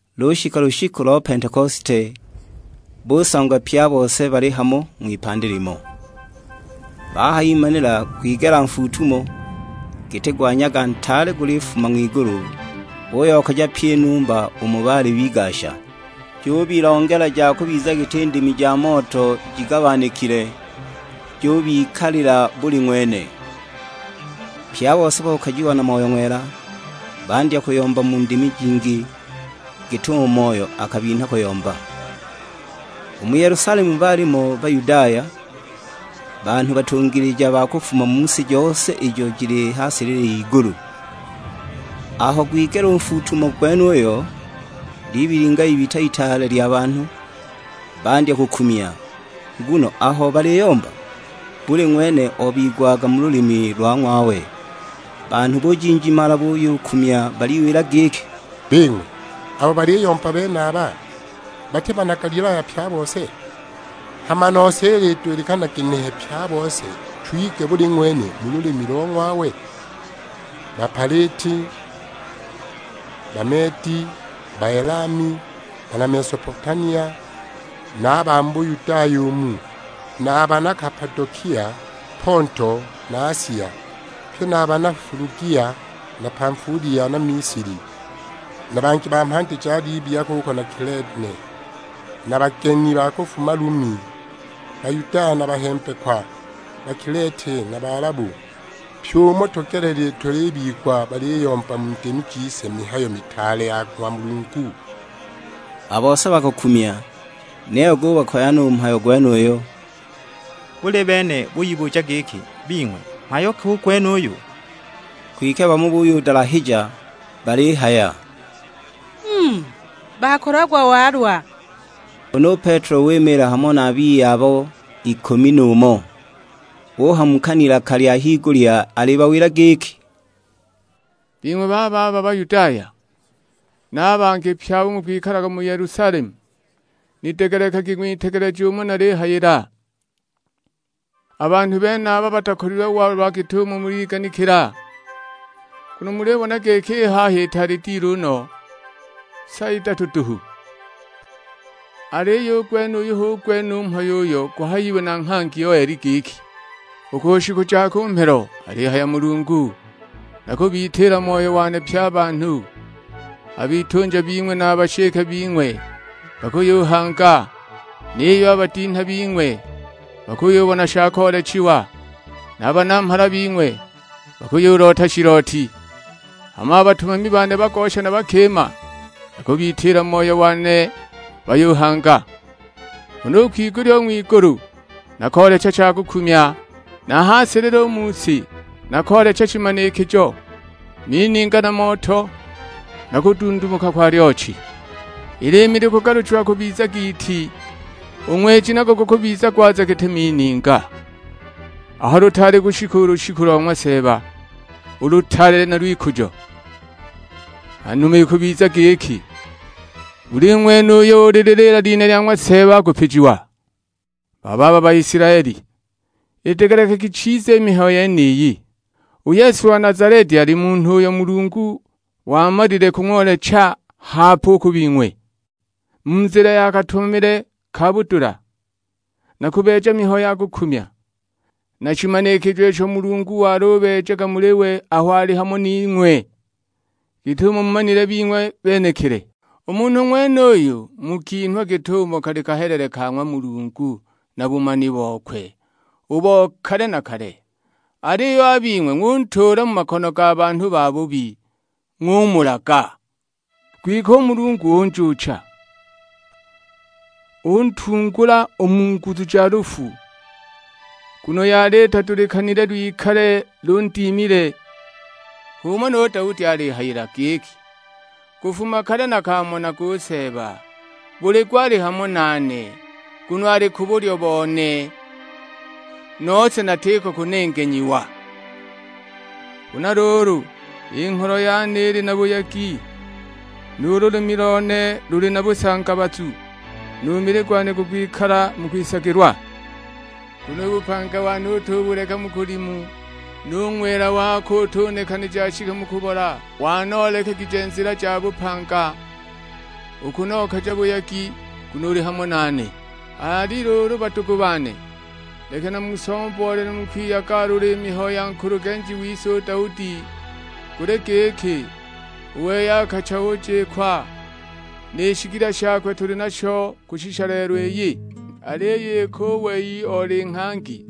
Lushika lushiku lo Pentekosite, busangwa pye a bose bali hamo, ng'wipandi limo. Bahayimanila gwigela nfuutumo, giti gwa nyaga ntaale gulifuma ng'wigulu; guyokaja pyi i numba umo baali bigasha. Jubilongela ja kubiza giti ndimi ja moto jigabanikile, jubikalila buli ng'wene. Pye a bose bokajiwa na Moyo Ng'wela, bandya kuyomba mu ndimi jingi, git'umo Moyo akabinha kuyomba. U mu Yelusalemu baalimo Bayudaya; banhu batungilija ba kufuma mu si jose ijo jili ha silili y'igulu. Aho gwigela u nfuutumo gwenuyo, libilinga ibita itaale lya banhu, bandya kukumya. Nguno aho baliyomba, buli ng'wene obigwaga mu lulimi lwa ng'wawe. Banhu bujinjimala buyukumya baliwila giki, "Bing'we, abo baliyomba benaba, bati bana Galilaya pye a bose? Hama nose ilidulikana ginehe pye a bose twigwe buli ng'wene mu lulimi lo ng'wawe? Bapaliti, Bameedi, Baelami, bana Mesopotamia, na a ba mu Buyudaya umu, na bana Kapadokia, Ponto na Asia, pye na bana Fulugia na Pamfulia na Misili; na bangi ba mhandi ja Libya kuko na Kilene; na bageni ba kufuma Lumi, (Bayudaya na a bahembekwa), Bakileti na Balabu: pyi umo tugelelile tulibigwa baliyomba mu ndimi jise mihayo mitaale ya ng'wa Mulungu!" A bose bakakumya, niyo gubakoya no u mhayo gwenuyo; buli bene buyibuja giki, "Bing'we, mhayo ki u gwenuyu?" Kwike bamo buyudalahija balihaya, "Mm, bakolagwa walwa!" Huna u Petelo wimiila hamo na a biye abo ikumi n'umo; uhamuka n'ilaka lya higulya alibawila giki, "Bing'we bababa Bayudaya, na a bangi pye abo mukwikalaga mu Yelusalemu, nidegelekagi ng'witegeleje umo nalihayila. A banhu benaba batakolilwe walwa git'umo muliganikila, nguno mulibona giki i haha itaali dilu no, sa idatu duhu. Aliyo u gwenuyu hu gwene u mhayo uyo guhayiwe na nghangi Yoeli giki, 'U ku shiku ja ku mhelo, alihaya Mulungu, nakubitiila Moyo wane pye a banhu; a bitunja bing'we na a bashike bing'we bakuyuhanga, niyo a badinha bing'we bakuyubona sha koolechiwa, na a banamhala bing'we bakuyuloota shilooti. Hama a batumami bane bagosha na bakima nakubitiila Moyo wane bayuhanga. Huna u kwigulya u ng'wigulu, nakoolecha shakukumya, na a ha silili u mu si nakoolecha shimanikijo; mininga na moto, na kudundumuka kwa lyochi. I liimi likugaluchiwa kubiza giiti, u ng'weji nago gukubiza gwaza giti mininga, aho lutaali kushika u lushiku lo ng'wa Seeba, u lutaale na lw'ikujo. Hanuma ikubiza giki, buli ng'wene uyo ulililiila lina lya ng'wa Seeba akupijiwa.' "Bababa Baisilaeli, idegelekagi chiza i mihayo yeniyi; u Yesu wa Nazaleti ali munhu uyo Mulungu wamalile kung'oolecha hape u ku bing'we, mu nzila ya katumamile ka budula, na kubeeja mihayo ya kukumya, na shimanikijo isho Mulungu walubeejaga muli we aho ali hamo ning'we, git'umo mumanilile bing'we benekili. U munhu ng'wenuyo mukinhwa git'umo kali kahelele ka ng'wa Mulungu na bumani bokwe, u bo kale na kale. Aliyo a bing'we ng'untuula mu makono ga banhu babubi, ng'umulaga! Kwike u Mulungu unjuucha, untungula u mu nguzu ja lufu, nguno yali itadulikanile lwikale lundimile. H'umo nu Daudi alihayila; giki, 'Kufuma kale nakaamonaga u Seeba, buli gwa ali hamo nane, nguno ali ku bulyo bone, nose natiko kunengenyiwa. Huna luulu, i ngholo yane ili na buyegi, nu lulimi lone luli na busangabazu. Nu mili gwane gukwikala mu kwisagilwa, nguno u bupanga bone utubuleka mu kulimu, nu Ng'wela wako utunekanija ashike mu kubola. Wanoolekegije nzila ja bupanga, ukunokaja buyegi, nguno uli hamo nane.' "Ali luulu badugu bane, leki namusomboolele mu kwiyagalula i mihayo ya nkulugenji wise u Daudi. Guli giki, u wei akacha ujikwa, ni shigila shakwe tuli nasho kushisha lelo iyi. Aliyo iki u wei oli nghangi,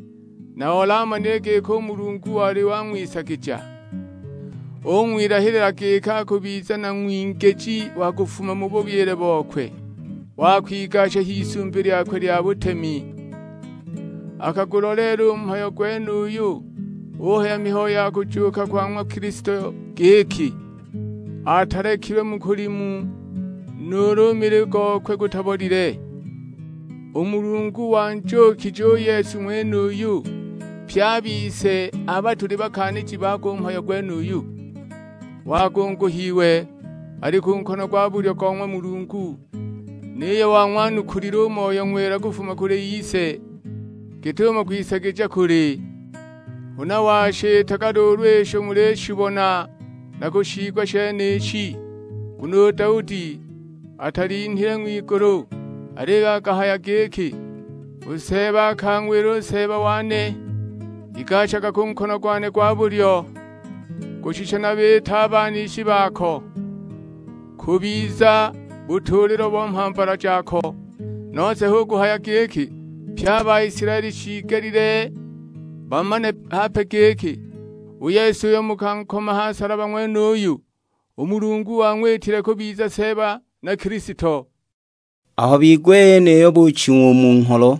na oli amanile giki u Mulungu wali wang'wisagija, ung'wilahilila giki akubiza na ng'wingiji wa kufuma mu bubyile bokwe, wa kwigasha h'isumbi lyakwe lya butemi. Akaguloleela u mhayo gwenuyu, uhaya mihayo ya kujuuka kwa ng'wa Kilisto; giki, 'Atalekilwe mu kulimu, nuulu u mili gokwe gutabolile.' U Mulungu wanjuukije u Yesu ng'wenuyu: pye a bise aba tuli bakaaniji bago u mhayo gwenuyu. Wagunguhiwe, ali ku nkono gwa bulyo go ng'wa Mulungu; niyo wang'wanukulile u Moyo Ng'wela kufuma kuli Ise, git'umo kwisagija kuli. Huna washiitaga luulu isho mulishibona na kushiigwa shenishi. Nguno u Daudi atalinhile ng'wigulu, aliyo akahaya giki, 'U Seeba akang'wila u Seeba wane, igashaga ku nkono gwane gwa bulyo; kushisha nabiite a banishi bako kubiza butuulilo bo mhambala jako.' "Nose hu kuhaya giki, pye a Baisilaeli shiigelile bamane hape giki, u Yesu uyo mukankoma ha nsalaba ng'wenuyu, u Mulungu wang'witile kubiza Seeba na Kilisto!" Aho bigwa i yeniyo buching'wa u mu ngholo,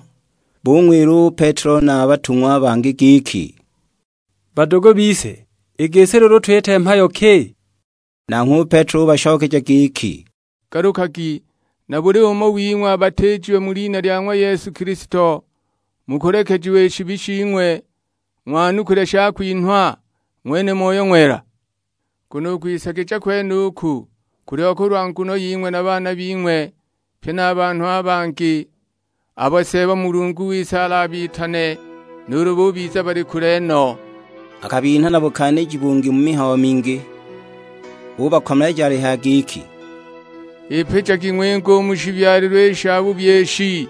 bung'wila u Petelo na a batung'wa a bangi giki, "Badugu bise, i gisi luulu twite mhayo ki?" Nanghwe u Petelo ubashokeja giki, "Galukagi, na buli umo wing'we abatiijiwe mu lina lya ng'wa Yesu Kilisto, mukulekejiwa i shibi shing'we, ng'wanukule shakwinhwa; ng'wene Moyo Ng'wela. Nguno u kwisagija kwenuku, kuliho kulwa nguno ying'we na baana bing'we, pye na a banhu a bangi, abo Seeba Mulungu wise alabitane; nuulu bubiza bali kule no." Akabinha na bukaaniji bungi mu mihayo mingi, ubakomeleja alihaya giki, "Ipijagi ng'winge u mu shibyalilwe i shabubi ishi!"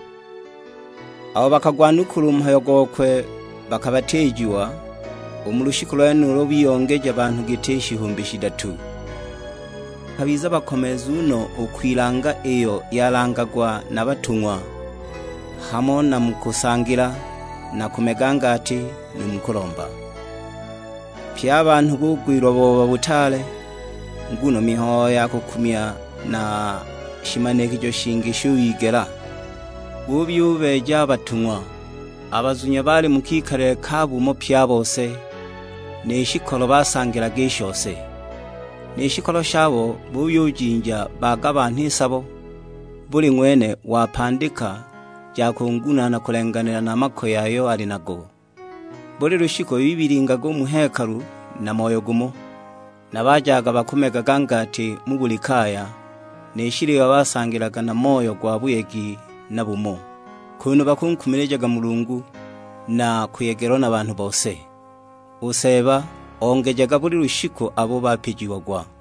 Abo bakagwanukula u mhayo gokwe bakabatiijiwa; u mu lushiku lwenulo biyongeja banhu giti shihumbi shidatu. Bakabiza bakomeezu no u kwilanga iyo yalangagwa na batung'wa; hamo na mu kusangila, na kumega ngati, nu mu kulomba. Pye a banhu bugwilwa booba butaale, nguno mihayo ya kukumya na shimanikijo shingi shuyigela; buyubeeja a batung'wa. A bazunya baali mu kikalile ka bumo pye a bose, ni shikolo basangilaga i shose. Ni shikolo shabo buyujinja bagabanha i sabo, buli ng'wene wapandika ja kungunaana kulenganila na makoye ayo ali nago. Buli lushiku bibilingaga u mu hekalu na moyo gumo; na bajaga bakumegaga ngati mu buli kaya, ni shiliwa basangilaga na moyo gwa buyegi na bumo, kunu bakunkumilijaga Mulungu, na kuyegelwa na banhu bose. U Seeba ongejaga buli lushiku abo bapijiagwa.